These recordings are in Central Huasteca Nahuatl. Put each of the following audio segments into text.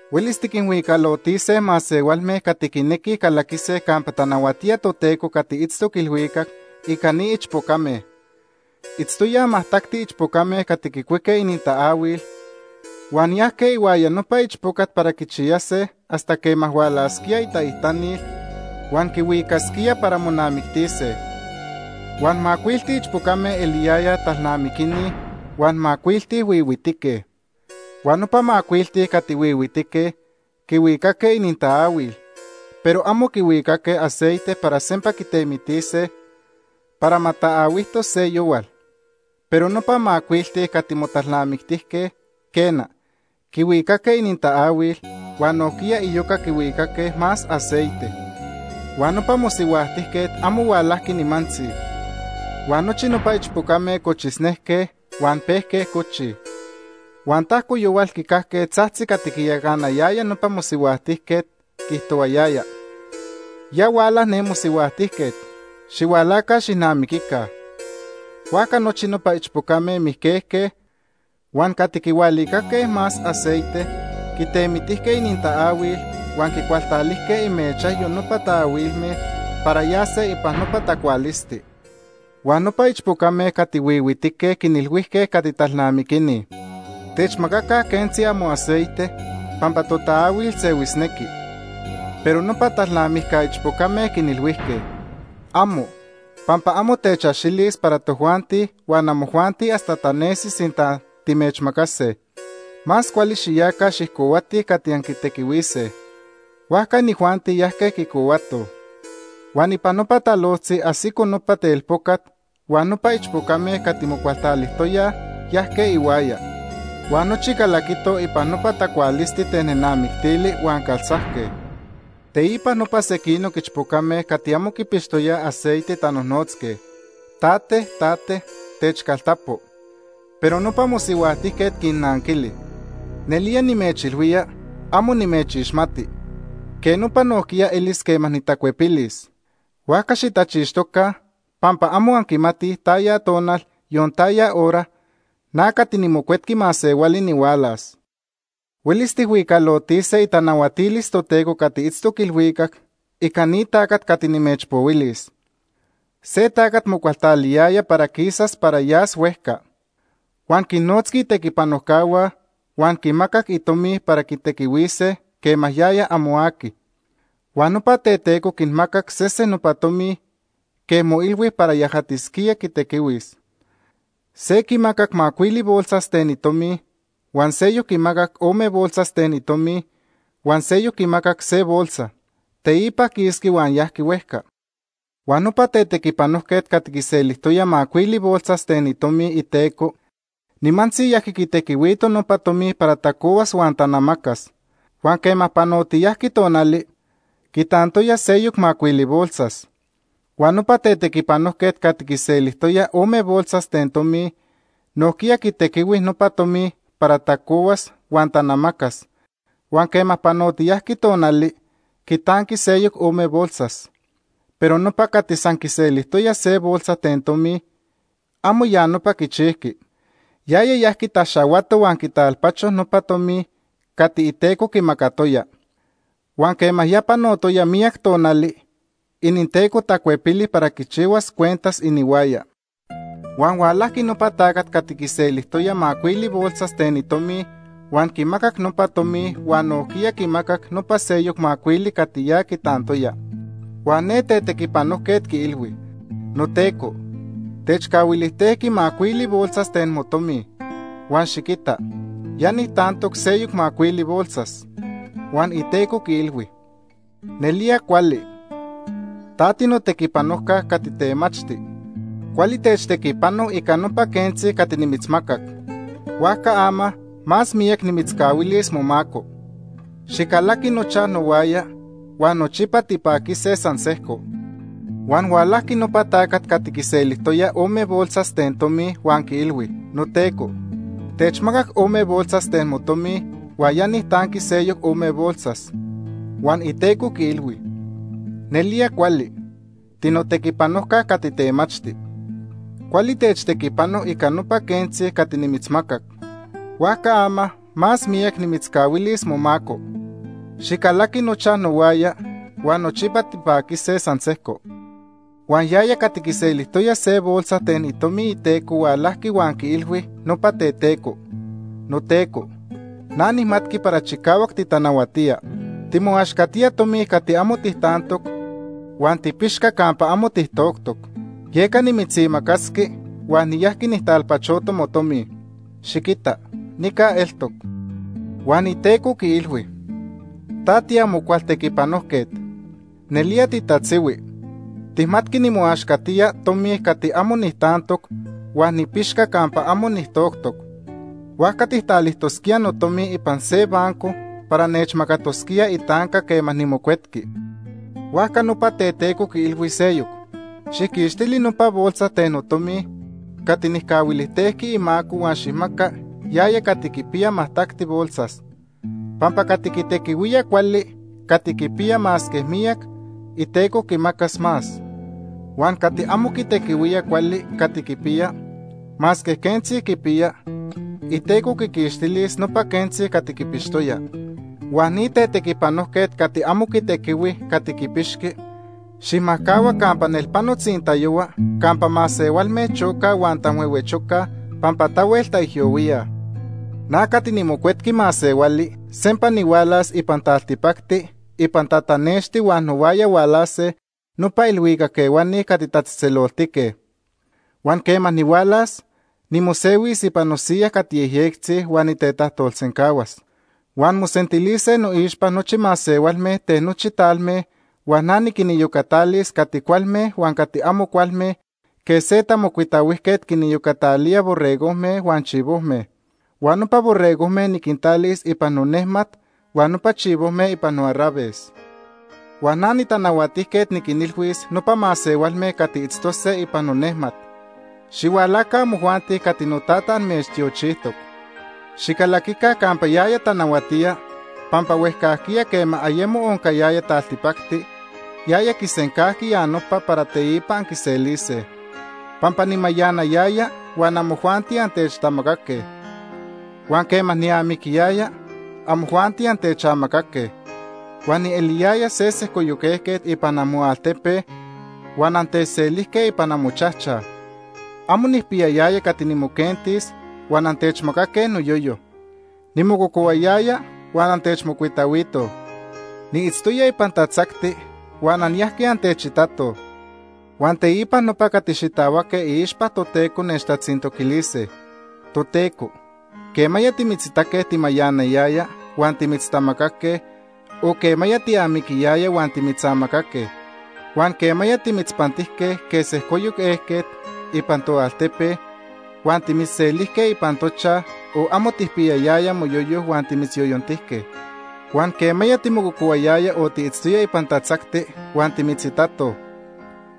“Huelis tiquinhuicalotise masehualme cati quinequij calaquise campa tanahuatía Toteco cati itztoc ilhuicac ica ni ichpocame. Itztoyaj majtacti ichpocame cati quicuique inintaahuil huan yajque ihuaya nopa ichpocat para quichiyase hasta quema hualasquía itaijtanil huan quihuicasquía para monamictise. Huan macuilti ichpocame eliyayaj talnamiquini huan macuilti huihuitique. Huan nopa macuilti cati huihuitique quihuicaque inintaahuil, pero amo quihuicaque aceite para sempa quitemitise para ma taahuijtos se yohual. Pero nopa macuilti cati motalnamictijque, quena, quihuicaque inintaahuil, huan nojquiya iyoca quihuicaque más aceite. Huan nopa mosihuajtijquet amo hualajqui nimantzi huan nochi nopa ichpocame cochisnejque huan pejque cochij. “Huan tajco yohual quicajque tzajtzi cati quiyacanayaya nopa mosihuajtijquet, quiijtohuayaya: ‘Ya huala ne mosihuajtijquet, xihualaca xijnamiquica.’ Huajca nochi nopa ichpocame mijquejque, huan cati quihualicaque más aceite quitemitijque inintaahuil huan quicualtalijque imechajyo nopa taahuilme para yase ipan nopa tacualisti. Huan nopa ichpocame cati huihuitique quinilhuijque cati talnamiquini: ‘Techmacaca quentzi amoaceite pampa totaahuil sehuisnequi.’ “Pero nopa talnamijca ichpocame quinilhuijque: ‘Amo, pampa amo techaxilis para tojuanti huan amojuanti hasta tanesis sinta timechmacase. Más cuali xiyaca xijcohuatij cati anquitequihuise.’ “Huajca inijuanti yajque quicohuatoj. Huan ipan nopa talojtzi ajsico nopa telpocat huan nopa ichpocame cati mocualtalijtoyaj yajque ihuaya. Huan nochi calaquitoj ipan nopa tacualisti ten nenamictili huan caltzajque. Teipa nopa sequinoc ichpocame cati amo quipixtoyaj aceite tanojnotzque: ‘Tate, tate, techcaltapo.’ “Pero nopa mosihuajtijquet quinnanquili: ‘Nelía nimechilhuía, amo nimechixmati.’ “Quej nopa nojquiya elis quema nitacuepilis. Huajca xitachixtoca pampa amo anquimatij taya tonal, yon taya hora, na cati niMocuetqui Masehuali nihualas. “Huelis tijhuicalotise itanahuatilis Toteco cati itztoc ilhuicac, ica ni tacat cati nimechpohuilis. Se tacat mocualtaliyaya para quisas para yas huejca. Huan quinnotzqui itequipanojcahua huan quinmacac itomi para quitequihuise quema yaya amo aqui. “Huan nopa teteco quimacac sese nopa tomi quej moilhui para yajatis quitequihuis. Se quimacac macuili bolsas ten itomi, huan seyoc quimacac ome bolsas ten itomi, huan seyoc quimacac se bolsa. Teipa quisqui huan yajqui huejca. Huan nopa tetequipanojquet cati quiselijtoya macuili bolsas ten itomi iteco nimantzi yajqui quitequihuito nopa tomi para tacohuas huan tanamacas, huan quema panotiyajqui tonali, quitantoya seyoc macuili bolsas. Huan nopa tetequipanojquet cati quiselijtoya ome bolsas ten itomi nojquiya quitequihui nopa tomi para tacohuas huan tanamacas huan quema panotiyajqui tonali, quitanqui seyoc ome bolsas. Pero nopa cati san quiselijtoya se bolsa ten itomi, amo ya nopa quichijqui. Yaya yajqui taxahuato huan quitalpacho nopa tomi cati iteco quimacatoya. “Huan quema ya panotoya miyac tonali, ininteco tacuepili para quichihuas cuentas inihuaya. Huan hualajqui nopa tacat cati quiselijtoya macuili bolsas ten itomi huan quimacac nopa tomi huan nojquiya quimacac nopa seyoc macuili cati ya quitantoya. Huan ne tetequipanojquet quiilhui: ‘Noteco, techcahuilijtejqui macuili bolsas ten motomi, huan xiquita ya nijtantoc seyoc macuili bolsas.’ Huan iteco quiilhui: ‘Nelía cuali. Ta tinotequipanojca cati temachti. Cuali techtequipano ica nopa quentzi cati nimitzmacac. Huajca ama más miyac nimitzcahuilis momaco. Xicalaqui nochaj nohuaya huan nochipa tipaquise san sejco.’ “Huan hualajqui nopa tacat cati quiselijtoya ome bolsas ten tomi huan quiilhui: ‘Noteco, techmacac ome bolsas ten motomi huan ya nijtanqui seyoc ome bolsas.’ “Huan iteco quiilhui: ‘Nelía cuali. Tinotequipanojca cati temachti. Cuali techtequipano ica nopa quentzi cati nimitzmacac. Huajca ama más miyac nimitzcahuilis momaco. Xicalaqui nochaj nohuaya huan nochipa tipaquise san sejco.’ “Huan yaya cati quiselijtoya se bolsa ten itomi iteco hualajqui huan quiilhui nopa teteco: ‘Noteco, na nijmatqui para chicahuac titanahuatía. Timoaxcatijque tomi cati amo tijtantoc huan tipixca campa amo tijtoctoc. Yeca nimitzimacasqui huan niyajqui nijtalpachoto motomi. Xiquita nica eltoc.’ “Huan iteco quiilhui: ‘Ta tiamo cual tetequipanojquet. Nelía titatzihui. Tijmatqui nimoaxcatía tomi cati amo nijtantoc huan nipixca campa amo nijtoctoc. Huajca tijtalijtosquía notomi ipan se banco para nechmacatosquíaj itanca quema nimocuetqui.’ “Huajca nopa teteco quiilhui seyoc: ‘Xijquixtili nopa bolsa ten notomi cati nijcahuilijtejqui imaco huan xijmaca yaya cati quipiya majtacti bolsas. Pampa cati quitequihuía cuali cati quipiya masque miyac, iteco quimacas más. Huan cati amo quitequihuía cuali cati quipiya, masque quentzi quipiya, iteco quiquixtilis nopa quentzi cati quipixtoya. Huan ni tetequipanojquet cati amo quitequihui cati quipixqui, xijmajcahua campa nelpano tzintayohua, campa masehualme chocaj huan tanhuehuechocaj pampa tahuel taijyohuíaj.’ “Na cati niMocuetqui Masehuali sempa nihualas ipan taltipacti ipan tatanexti huan nohuaya hualase nopa ilhuicac ehuani cati tatzejtzeloltique. Huan quema nihualas, nimosehuis ipan nosiya cati yejyectzi huan nitetajtolsencahuas. Huan mosentilise noixpa nochi masehualme ten nochi talme huan na niquiniyocatalis cati cualme huan cati amo cualme quej se tamocuitahuijquet quiniyocatalía borregojme huan chivojme. Huan nopa borregojme niquintalis ipan nonejmat huan nopa chivojme ipan noarraves. Huan na nitanahuatijquet niquinilhuis nopa masehualme cati itztose ipan nonejmat: ‘Xihualaca amojuanti cati noTata amechtiochijtoc. Xicalaquica campa yaya tanahuatía, pampa huejcajquiya quema ayemo oncayaya taltipacti, yaya quisencajqui ya nopa para teipa anquiselise. Pampa nimayanayaya huan amojuanti antechtamacaque, huan quema niamiquiyaya, amojuanti antechamacaque. Huan nieliyaya se sejcoyoc ejquet ipan amoaltepe, huan antechselijque ipan amochajchaj. Amo nijpiyayaya cati nimoquentis huan antechmacaque noyoyo. Nimococohuayaya huan antechmocuitahuitoj. Niitztoya ipan tatzacti huan anyajque antechitatoj.’ “Huan teipa nopa cati xitahuaque iixpa Toteco nechtatzintoquilise: ‘Toteco, ¿quemaya timitzitaque timayanayaya huan timitztamacaque, o quema tiamiquiyaya huan timitzamacaque? Huan ¿quemaya timitzpantijque quej se sejcoyoc ejquet ipan toaltepe, huan timitzselijque ipan tochajchaj, o amo tijpiyayaya moyoyo huan timitzyoyontijque? Huan ¿quemaya timococohuayaya o tiitztoya ipan tatzacti huan timitzitatoj?’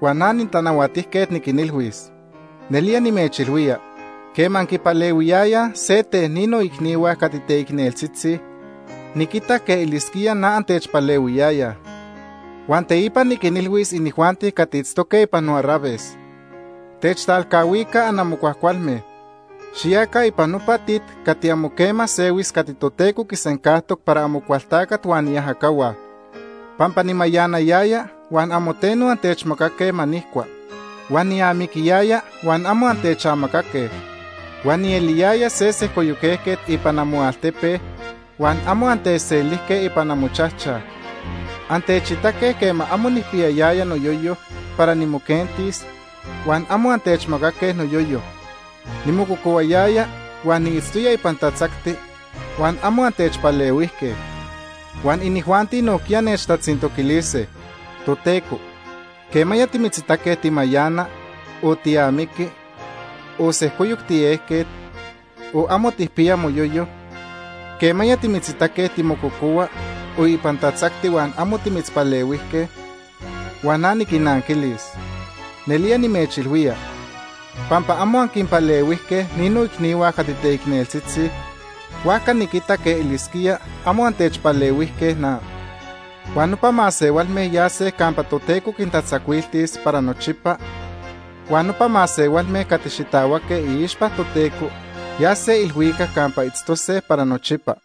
“Huan na niTanahuatijquet niquinilhuis: ‘Nelía nimechilhuía, quema anquipalehuiyayaj se ten ni noicnihua cati teicneltzitzi, niquitac quej elisquía na antechpalehuiyayaj.’ “Huan teipa niquinilhuis inijuanti cati itztoque ipan noarraves: ‘Techtalcahuica anamo cuajcualme. Xiyaca ipan nopa tit cati amo quema sehuis cati Toteco quisencajtoc para Amocualtacat huan iajacahua. Pampa nimayanayaya huan amo teno antechmacaque ma nijcua, huan niamiquiyaya huan amo antechamacaque. Huan nieliyaya se sejcoyoc ejquet ipan moaltepe, huan amo antechselijque ipan amochajchaj. Antechitaque quema amo nijpiyayaya noyoyo para nimoquentis, huan amo antechmacaque noyoyo. Nimococohuayaya huan niitztoya ipan tatzacti, huan amo antechpalehuijque.’ “Huan inijuanti nojquiya nechtatzintoquilise: ‘Toteco, ¿quemaya timitzitaque timayana, o tiamiqui, o sejcoyoc tiejquet, o amo tijpiya moyoyo? ¿Quemaya timitzitaque timococohua o ipan tatzacti huan amo timitzpalehuijque?’ “Huan na niquinnanquilis: ‘Nelía nimechilhuía, pampa amo anquinpalehuijque ni noicnihua cati teicneltzitzi, huajca niquita quej elisquía amo antechpalehuijque na.’ “Huan nopa masehualme yase campa Toteco quintatzacuiltis para nochipa, huan nopa masehualme cati xitahuaque iixpa Toteco yase ilhuicac campa itztose para nochipa.”